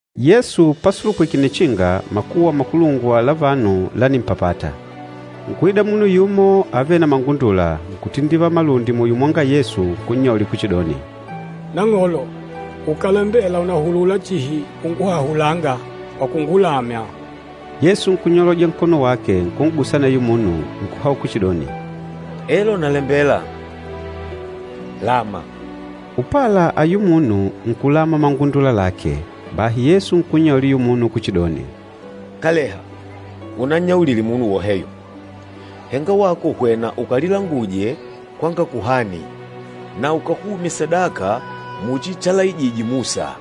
Yesu pasulupwike nnichinga, makuwa makulungwa la vanu lánimpapata. Nkuida munu yumo avêle na mangundula, nkutindivala malundi muyo mwanga Yesu nkunnyaulila kuchidoni, “Nang'olo, ukàlembela ùnahulula chihi unguhahulanga kwa kungulamya.” Yesu nkunyoloja nkono wake, nkun'gusa aneyo munu, nkuhaula kuchidoni, “Elo nalembela, lama.” Upala ayula munu, nkulama mangundula lake. Bahi Yesu nkunnyaulila ayula munu kuchidoni, “Kaleha, unannyaulile munu woheyo, henga wako hwena ukalilanguje kwanga kuhani, na ukahumye sadaka muchi chalaijije Musa,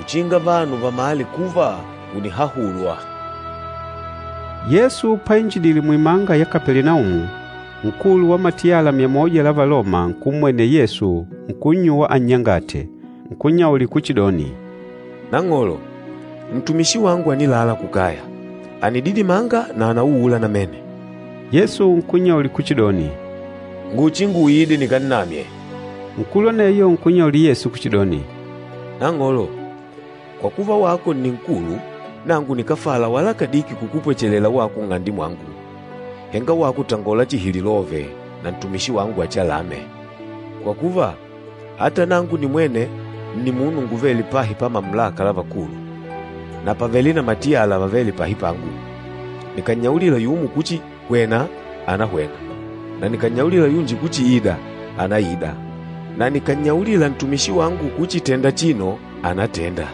uchinga vanu vamale kuva ùnihahulwa.” Yesu painjidile muimanga ya Kapelinaumu, nkulu wa matiyala myamoja la Valoma nkummwenela Yesu, nkunnyuwa annyangate. Nkunnyaulila kuchidoni, “Nang'olo, ntumishi wangu ànilala kukaya, ànididimanga na ànauula namene.” Yesu nkunnyaulila kuchidoni, “Nguchinguide nikannamye.” Nkulu aneyo nkunnyaulila Yesu kuchidoni, “Nang'olo, kwa kuva wako ni nkulu, nangu nikáfala wala kadiki kukupwechelela wako nng'ande mwangu. Henga wako tangola chihi lilove, na ntumishi wangu achialame. Kwa kuva, ata nangu nimwene nni munu nguvêle pahi pa mamulaka la vakulu, na pàvele na matiyala vavêle pahi pangu. Nikànnyaulila yumo kuchi, ‘Hwena!,’ ànahwena, na nikànnyaulila yunji kuchi, ‘Ida!,’ ànaida, na nikànnyaulila ntumishi wangu kuchi, ‘Tenda achino!,’ ànatenda.”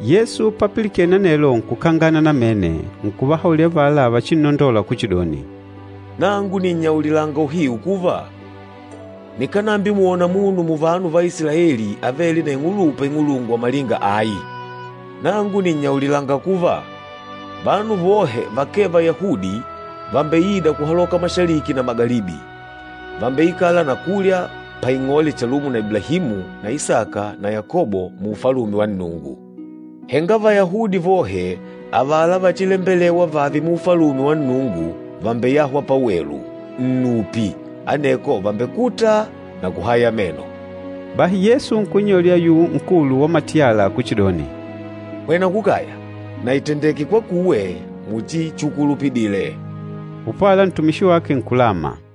Yesu papilikene anelo nkukangana namene, nkuvahaulila avala vachinnondola kuchidoni, “Nangu nìnnyaulilanga uhiu kuva, nikánambimwona munu muvanu va Isilaeli avêle na ing'ulupa ing'ulungwa malinga ayi. Nangu nìnnyaulilanga kuva, vanu vohe vakee Vayahudi vàmbeida kuhaloka kumanga na kundonde, vambeikala na kulya paing'ole chalumo na Iblahimu na Isaka na Yakobo mu Ufalume wa Nnungu. Henga Vayahudi vohe, avala vachilembelewa vàavè mu Ufalume wa Nnungu vàmbeyahwa pawelu, nnupi, aneko vàmbekuta na kuhaya meno.” Bahi Yesu nkunnyaulila ayula nkulu wa matiyala kuchidoni, “Hwena kukaya, na ìtendeke kwakuwe muchi chukulupidile.” Upala ntumishi wake nkulama.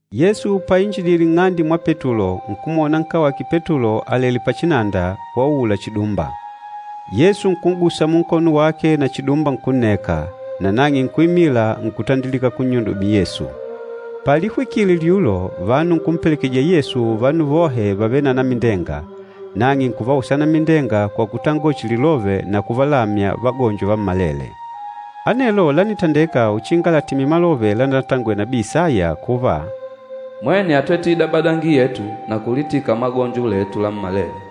Yesu painjidile nng'ande mwa Petulo, nkumwona nkawake Petulo àlelé pachinanda, wauula chidumba. Yesu nkun'gusa munkono wake na chidumba nkunneka, nanang'e nkuimila nkutandilika kunnyudumila Yesu. Palihwikile lyulo, vanu nkumpelekejije Yesu vanu vohe vavêle na anamindenga, nang'e nkuvausa anamindenga kwa kutangola chihi lilove na kuvalamya vagonjo vammalele. Anelo lánitendeka uchinga latimile malove lanatangwele nabii Isaya kuva, “Mwene átwete idabadangi yetu na kulitika magonjo letu lammalele.”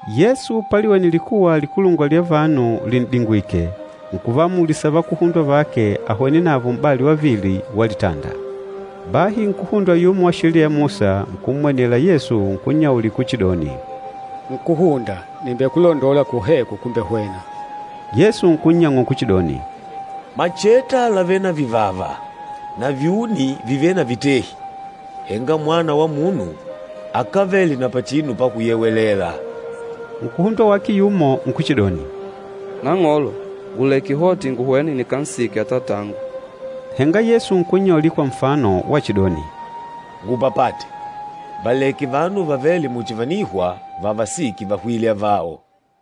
Yesu paliwene likuwa likulungwa lya vanu lin'dingwìkè, nkuvaamulisa vakuhundwa vake ahwene navo m'bali wavili wa litanda. Bahi nkúhundwa yumo wa Sheliya ya Musa, nkummwenela Yesu, nkunnyaulila kuchidoni, “Nkúhunda, nìmbekulondola kwoheko kumbehwena.” Yesu nkunnyang'ula kuchidoni, “Macheta làvele na vivava na vyuni vìvele na vitehi, henga Mwana wa Munu, akávele na pachinu pakuyewelela.” Nkúhundwa wake yumo nkuchidoni, “Nang'olo, nguleke hoti nguhwene nikansike atatangu.” Henga Yesu nkunnyaulila kwa nfano wachidoni, “Ngupapate, valeke vanu vavêle muchi vànihwa vavasike vahwîle avao.”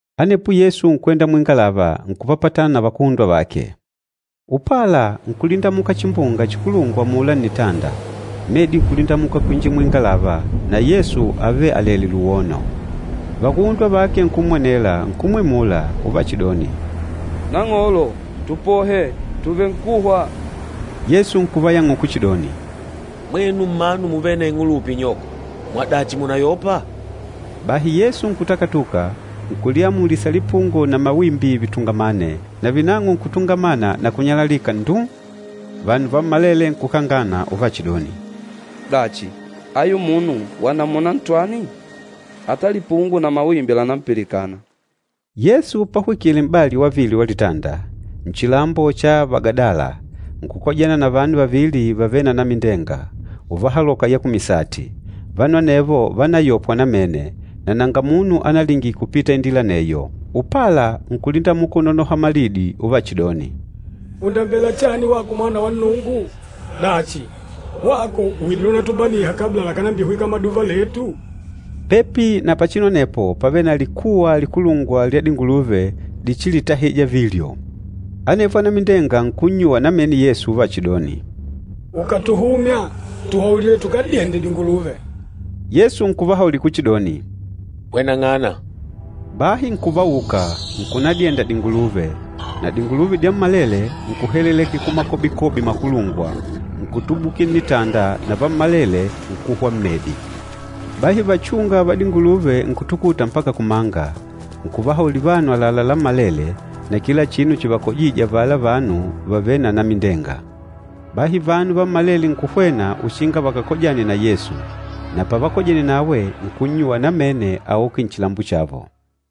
Anepo Yesu nkwenda muingalava, nkupapatana na vakuhundwa vake. Upala nkulindamuka chimbunga chikulungwa amula nnitanda, medi nkulindamuka kwinjila muingalava, na Yesu ávele alèlè luwono. Vakuhundwa vake nkummwenela, nkumwimula, uvachidoni, “Nang'olo, tupohe, tùvenkuhwa!” Yesu nkuvayang'ula kuchidoni, “Mwenu mmanu muvêle na ing'ulupa inyoko, mwadachi mùnayopa?” Bahi Yesu nkutakatuka, nkuliamulisa lipungo na mawimbi vitungamane, navinang'o nkutungamana na kunyalalika nduu. Vanu vammalele nkukangana, uvachidoni, “Dachi, ayu munu wa namuna ntwani? Ata lipungo na mawimbi lànampilikana!” Yesu pahwikile m'bali wavili wa litanda, nchilambo cha Vagadala, nkukojana na vanu vavili vavêle na anamindenga, uvahaloka ya kumisati. Vanu anevo vánayopwa namene, na nanga munu analingile kupita indila aneyo. Upala, nkulindamuka unonoha malidi uvachidoni, “Ùndambela chani wako Mwana wa Nnungu? Dachi, wako widîle unatubaniha kabla lakànambihwika maduva letu?” Pepi na pachinu anepo, pávele na likuwa likulungwa lya dinguluve dichilitahija vilyo. Anevo anamindenga nkunnyuwa namene Yesu uvachidoni, “Ukàtuhumya, tuhaulile tukadyende dinguluve.” Yesu nkuvahaulila kuchidoni, “Hweneng'ana!” Bahi nkuvauka, nkunadyenda dinguluve, na dinguluve dyammalele nkuhelelekela kumakobikobi makulungwa, nkutubukila nnitanda na vammalele nkuhwa mmedi. Bahi vachúnga va dinguluve nkutukuta mpaka kumanga, nkuvahaulila vanu àlalá lammalele, na kila chinu chivakojîje avala vanu vavêle na anamindenga. Bahi vanu vammalele nkuhwena uchinga vakakojane na Yesu. Na pavakojene nawe, nkunnyuwa namene auke nchilambo chavo.